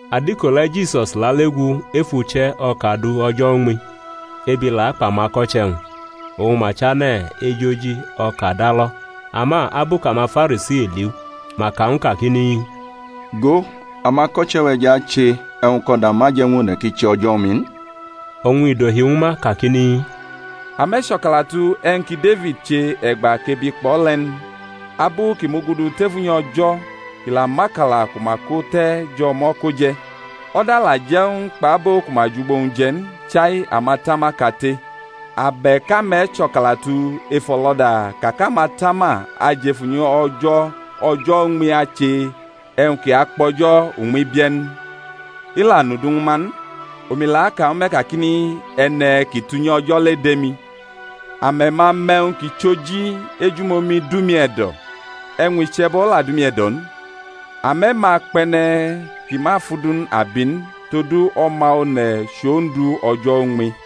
Adiko le̩ Jisus lale gu ef uche̩ o̩ka du o̩jo̩ uñmi; ebi la akpʼamako̩che̩-wñ, oñ ma chane̩ ejʼoji o̩ka da lo̩. Ama abu kʼamaFarisi liʼu ma ka ñw u kakini, Go, amako̩che̩-we̩ jʼache e̩wñ kʼo̩da ma je̩ ñw one̩ ki che o̩jo̩ uñmi n. Oñ i dohi ñwu ma kakini, Ame̩ cho̩kalatu e̩wñ ki Defid che e̩gba kʼebi kpʼo̩ le̩ n? Abu kʼi mugudu tef unyi O̩jo̩ kʼi la mʼakala ku ma ko te̩ jʼo̩mo̩ ko je̩; o̩da la je̩ ñw u kpʼabo ku ma jʼugbo-wñ je̩ n, chai amatama kate. Abe̩k ame̩ cho̩kalatu ef o̩lo̩da ka kʼamatama ajʼef unyi O̩jo̩ o̩jo̩ uñmi ache e̩wñ kʼi akpʼo̩jo̩ uñmi bie̩ n? I la nʼudu ñwu ma n. Omi la aka ñwu me̩ kakini, E̩ne̩ kʼi tʼunyi O̩jo̩ le dʼemi. Ame̩ ma mʼe̩wñ kʼi chʼoji, Ejumomi dʼumi e̩do̩, e̩wñ iche̩bo̩ la dʼumi e̩do̩ n, ame̩ ma kpʼe̩ne̩ kʼi ma fʼudu n abi n. Todu O̩ma One̩ chʼOndu o̩jo̩ uñmi.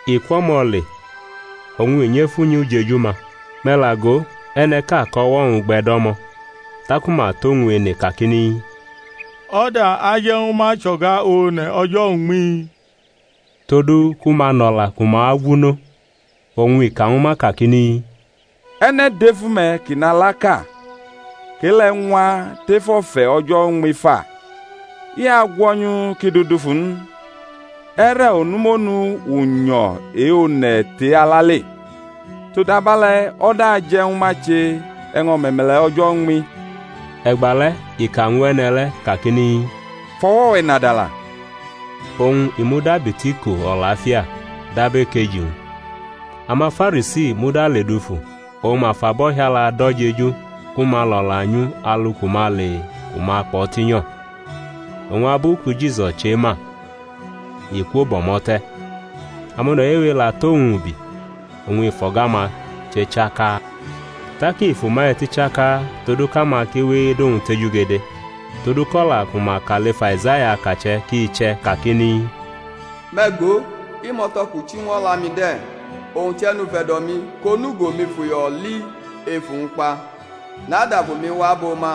I kwʼo̩mo̩ le oñ i nyʼef unyi ujeju-ma. Me̩ la go, e̩ne̩ʼka kʼo̩wo̩-wñ gbe̩ do̩mo̩. Taku ma tʼowñ ene kakini, O̩da aje̩ ñwu ma chʼo̩ga one̩ o̩jo̩ uñmi? todu ku ma nʼo̩la ku ma agwu nʼo. Oñ i ka ñwu ma kakini, E̩ne̩ dʼef ume̩ kʼi nʼalaʼka, kʼe-le̩ ñwa tef o̩fe̩ o̩jo̩ uñmi fa? I agwo̩nyʼu kʼi dʼu dufu n? E̩re̩ onu monu unyo̩ e-one̩ tʼe-ala le? Todabe̩le̩ o̩da aje̩ ñwu ma che e̩wñ o̩me̩me̩le̩ o̩jo̩ uñmi. E̩gba le̩ ika ñw e̩ne̩ le̩ kakini, Fʼo̩wo̩ we̩ nadala. Oñ i mudabi tʼiko o̩lafia dab ekeji-wñ. AmaFarisi muda ledufu oñ ma fʼabo̩hiala do̩ jeju ku ma lʼo̩la nyʼu alu ku ma ale ku ma akpʼo̩ tinyo̩. Oñ abu ki Jisus chema, i kwo bʼo̩mo̩ te̩; amone̩ wewe la tʼowñ ubi, oñ i fʼo̩ga-ma che chaka. Tak i fʼuma eti chaka todu kʼama ki we edʼowñ tejugede. Todu kʼo̩la ku ma ka lef Aizaya akache̩ ki che̩ kakini, Me̩ go, Imo̩to̩ kʼu chi ñw o̩la-mi de̩, owñ chʼE̩nufe̩do̩-mi kʼonugo-mi fʼuyo̩ li ef uwñ kpa. NadʼAfu-mi wa abʼo ma,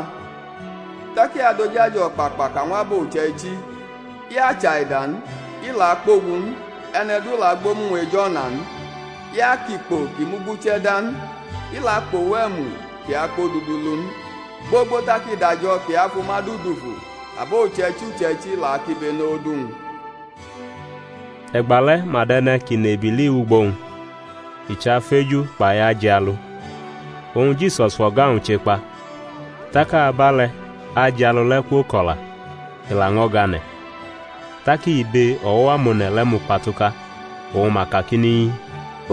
tak i adʼoj ajo̩ o̩kpakpa ka ñw abo uche̩ichi. I achaida n, i la akpogu n, e̩ne̩ du la agbʼomu-wñ ej o̩na n; i akʼikpo ki muguche̩ da n, i la akpʼowu e̩mu kʼi akpodudu lu n, gbogbo tak i dʼajo̩ kʼi afʼuma du dufu; abo uche̩ichi uche̩ichi la akibenʼodu-wñ. E̩gba le̩ ma dʼe̩ne̩ kʼi nʼebili wʼugbo-wñ, i chʼafeju kpai ajialu: oñ Jisus fʼo̩ga-wñ che kpa. Tak abale̩ ajialu le̩ kwoko̩la, i laño̩ gane̩. Tak ibe o̩wo̩ amone̩ le̩ mukpatuka, oñ ma kakini,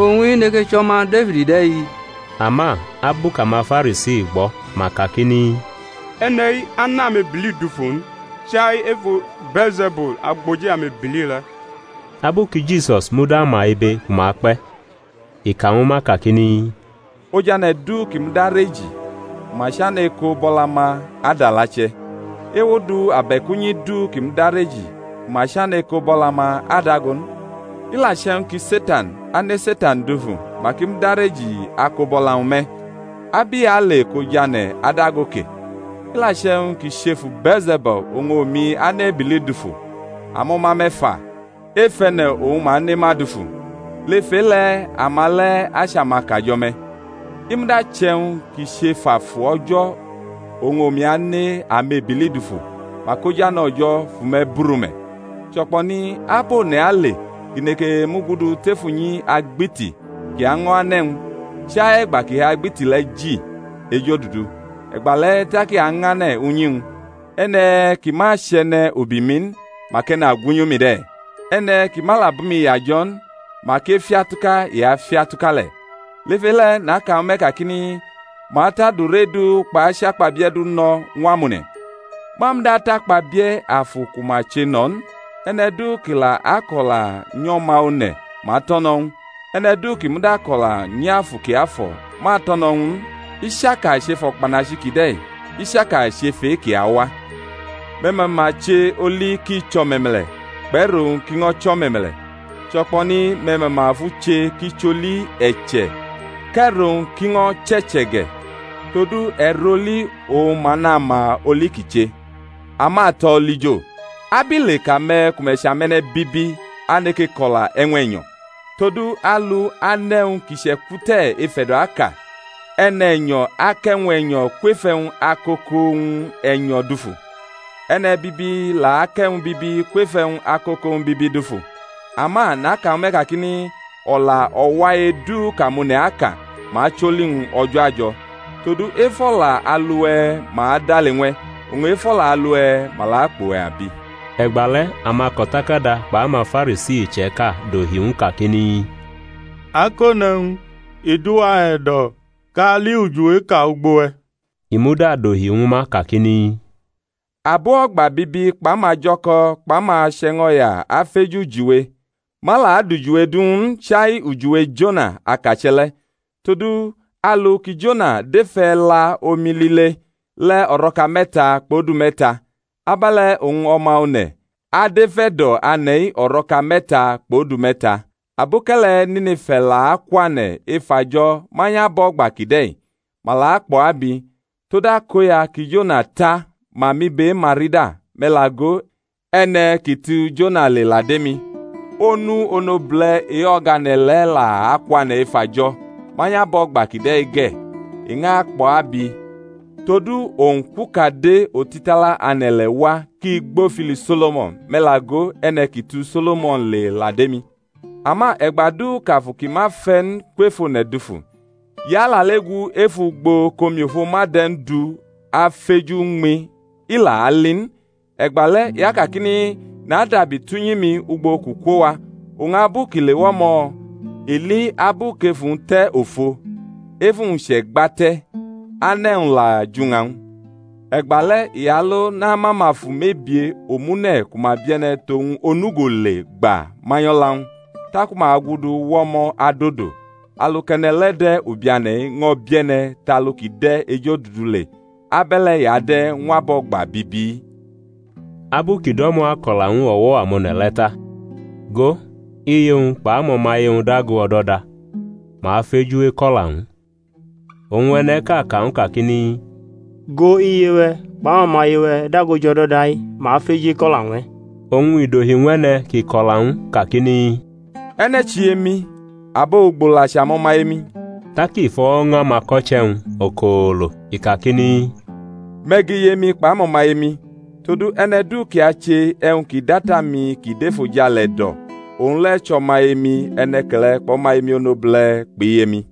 Owñ-i neke chʼO̩ma Defid de̩-i? Ama abu kʼamaFarisi gbo̩, ma kakini, E̩ne̩-i anʼamebili dufu n, chai efu Bee̩lze̩bul, agboji amebili le̩. Abu ki Jisus muda ma ibe ku ma kpe̩, i ka ñwu ma kakini, Ojane̩ du kʼi mudareji, ku ma chane̩ eko̩ bʼo̩la-ma adʼalache̩; ewo du abe̩k unyi du kʼi mudareji ku ma chane̩ eko bʼo̩la-ma adago n. I la che̩wñ ki Setan ane̩ Setan dufu mak i mudareji ako bʼo̩la-wñ me̩. Ab i ale kʼojane̩ adago ke? I la che̩wñ ki chʼefu Bee̩lze̩bul oñ omi ane̩ amebili dufu, amo̩ma-me̩ fa, ef e̩ne̩ oñ ma ane ma dufu? Lef e-le̩ ama le̩ achʼamakajo̩-me̩. I muda che̩wñ ki chʼef Afu O̩jo̩ oñ omi ane̩ amebili dufu, mak Ojane̩ O̩jo̩ fʼume̩ buru me̩. Cho̩kpo̩ni ab one̩ ale kʼi neke mugudu tef unyi agbiti kʼi año̩ ane̩-wñ, chai e̩gba kʼi fʼagbiti le̩ ji ejodudu? E̩gba le̩ tak i añʼane̩ unyi-wñ. E̩ne̩ ki ma chʼe̩ne̩ ubi-mi n, mak e̩nagwunyʼumi de̩. E̩ne̩ ki ma la bʼumi yajo̩ n mak efiatuka i afiatuka le̩. Lef e-le̩ naka ñwu me̩ kakini, Ma atʼadure du kpʼachakpabie̩ du no̩ ñw amone̩; ma muda atʼakpabie̩ Afu ku ma che no̩ n. E̩ne̩ du kʼi la akʼo̩la nyʼO̩ma One̩, ma atʼo̩ no̩ ñw u; e̩ne̩ du kʼi muda kʼo̩la nyʼAfu Kiafo̩, ma atʼo̩ no̩ ñw u n, i chaka chʼef o̩kpanachi kide̩, i chaka chʼef e-ki awa. Me̩ mama che oli kʼi chʼo̩me̩me̩le̩, kpʼe̩ro-wñ kʼi ño̩ chʼo̩me̩me̩le̩, cho̩kpo̩ni me̩ mama fʼu che kʼi chʼoli e̩che̩ kʼe̩ro-wñ kʼi ño̩ chʼe̩che̩ ge̩; todu e̩rʼoli oñ ma nʼama oli kʼi che. Amato̩ olijo, abile kʼame̩ ku me̩ chʼame̩ne̩bibi aneke ko̩la e̩wñ e̩nyo̩? Todu alu anʼe̩wñ ki chʼe̩kwute̩ ef e̩do̩ aka. E̩ne̩nyo̩ akʼe̩wñ e̩nyo̩ kwef e̩wñ akoko-wñ e̩nyo̩ dufu; e̩ne̩bibi la akʼe̩wñ bibi kwef e̩wñ akoko-wñ bibi dufu. Ama naka ñwu me̩ kakini, O̩la o̩wai du kʼamone̩ aka, ma acholi-wñ o̩jo̩ ajo̩. Todu ef o̩la alu-we̩ ma adale ñw e̩, oñ ef o̩la alu-we̩ ma la akpʼuwe̩ abi. E̩gbale̩ amako̩takada kpʼamaFarisi iche̩ka dohi ñw u kakini, Akone̩-wñ, i dʼuwa e̩do̩ kʼa ali ujiweʼka ugbo we̩. I muda dohi ñwu ma kakini, Abo o̩gba bibi kpʼamajo̩ko̩ kpʼamache̩ño̩ya afeju ujiwe; ma la adʼujiwe du ñw u n, chai ujiwe Jona, akache̩ le̩. Todu alu ki Jona dʼef e̩la omi lile le̩ o̩ro̩ka me̩ta kpʼodu me̩ta, abe̩le̩ oñ O̩ma One̩ adʼef e̩do̩ ane̩-i o̩ro̩ka me̩ta kpʼodu me̩ta. Aboke̩le̩ Nine̩fa la akwane̩ ef ajo̩ manyʼabo̩gba kide̩-i, ma la kpʼo̩ abi; tod akoya ki Jona ta ma mʼibe e-ma rida, me̩ la go, e̩ne̩ kʼi tu Jona le la dʼemi. Onu onobule̩ e-o̩gane̩ le̩ la akwane̩ ef ajo̩ manyʼabo̩gba kide̩-i ge̩, i ñʼakpʼo̩ abi: todu owñ kwʼukade otitala ane̩-ile̩ wa kʼi gbʼofili So̩lo̩mo̩n; me̩ la go, E̩ne̩ kʼi tu So̩lo̩mon le la dʼemi. Ama e̩gba du kʼafu ki ma fe̩ n kwʼef one̩ dufu, i alale gu ef ugbo kʼomiofo ma de̩ n du afeju uñmi, i la ali n. E̩gbale̩ i akakini, Nadabi tʼunyi-mi ugbo kʼu kwo wa; oñ abu kʼi lewa o̩mo̩, i li abu kʼefu-wñ te̩ ofo, efu-wñ chʼe̩gba te̩, ane̩-wñ la jʼuña-wñ. E̩gbale̩ i alo namʼamafu mebie omune̩ ku ma bie̩ne̩ tʼowñ onugo le gba manyʼo̩la-wñ, taku ma gudu wʼo̩mo̩ adodo. Alu kʼe̩ne̩ le̩ de̩ ubiane̩-i ño̩ bie̩ne̩ tʼalu kʼi de̩ ejodudu le. Abe̩le̩ i ade̩ ñw abo̩gba bibi-i. Abu kʼu do̩mo̩ ako̩la ñw o̩wo̩ amone̩ le̩ ta, go, iye-wñ kpʼamo̩maye-wñ dago o̩do̩da, ma feju eko̩la ñw u. Oñ e̩ne̩ʼka ka ñw u kakini, Go, iye-we̩ kpʼamo̩maye-we̩ dago jʼo̩do̩da-i, ma feju eko̩la ñw e̩. Oñ i dohi ñw e̩ne̩ kʼi ko̩la ñw u kakini, E̩ne̩ chʼiye-mi? abo ugbo la chʼamo̩maye-mi? Tak i fʼo̩wo̩ ña amako̩che̩-wñ okoolo, i kakini, Me̩ gʼiye-mi kpʼamo̩maye-mi. Todu e̩ne̩ du kʼi ache e̩wñ ki dʼAta-mi kʼi dʼefojale e̩do̩, owñ le̩ chʼo̩maye-mi e̩ne̩ke̩le̩ kpʼo̩maye-mi onobule̩ kpʼiye-mi.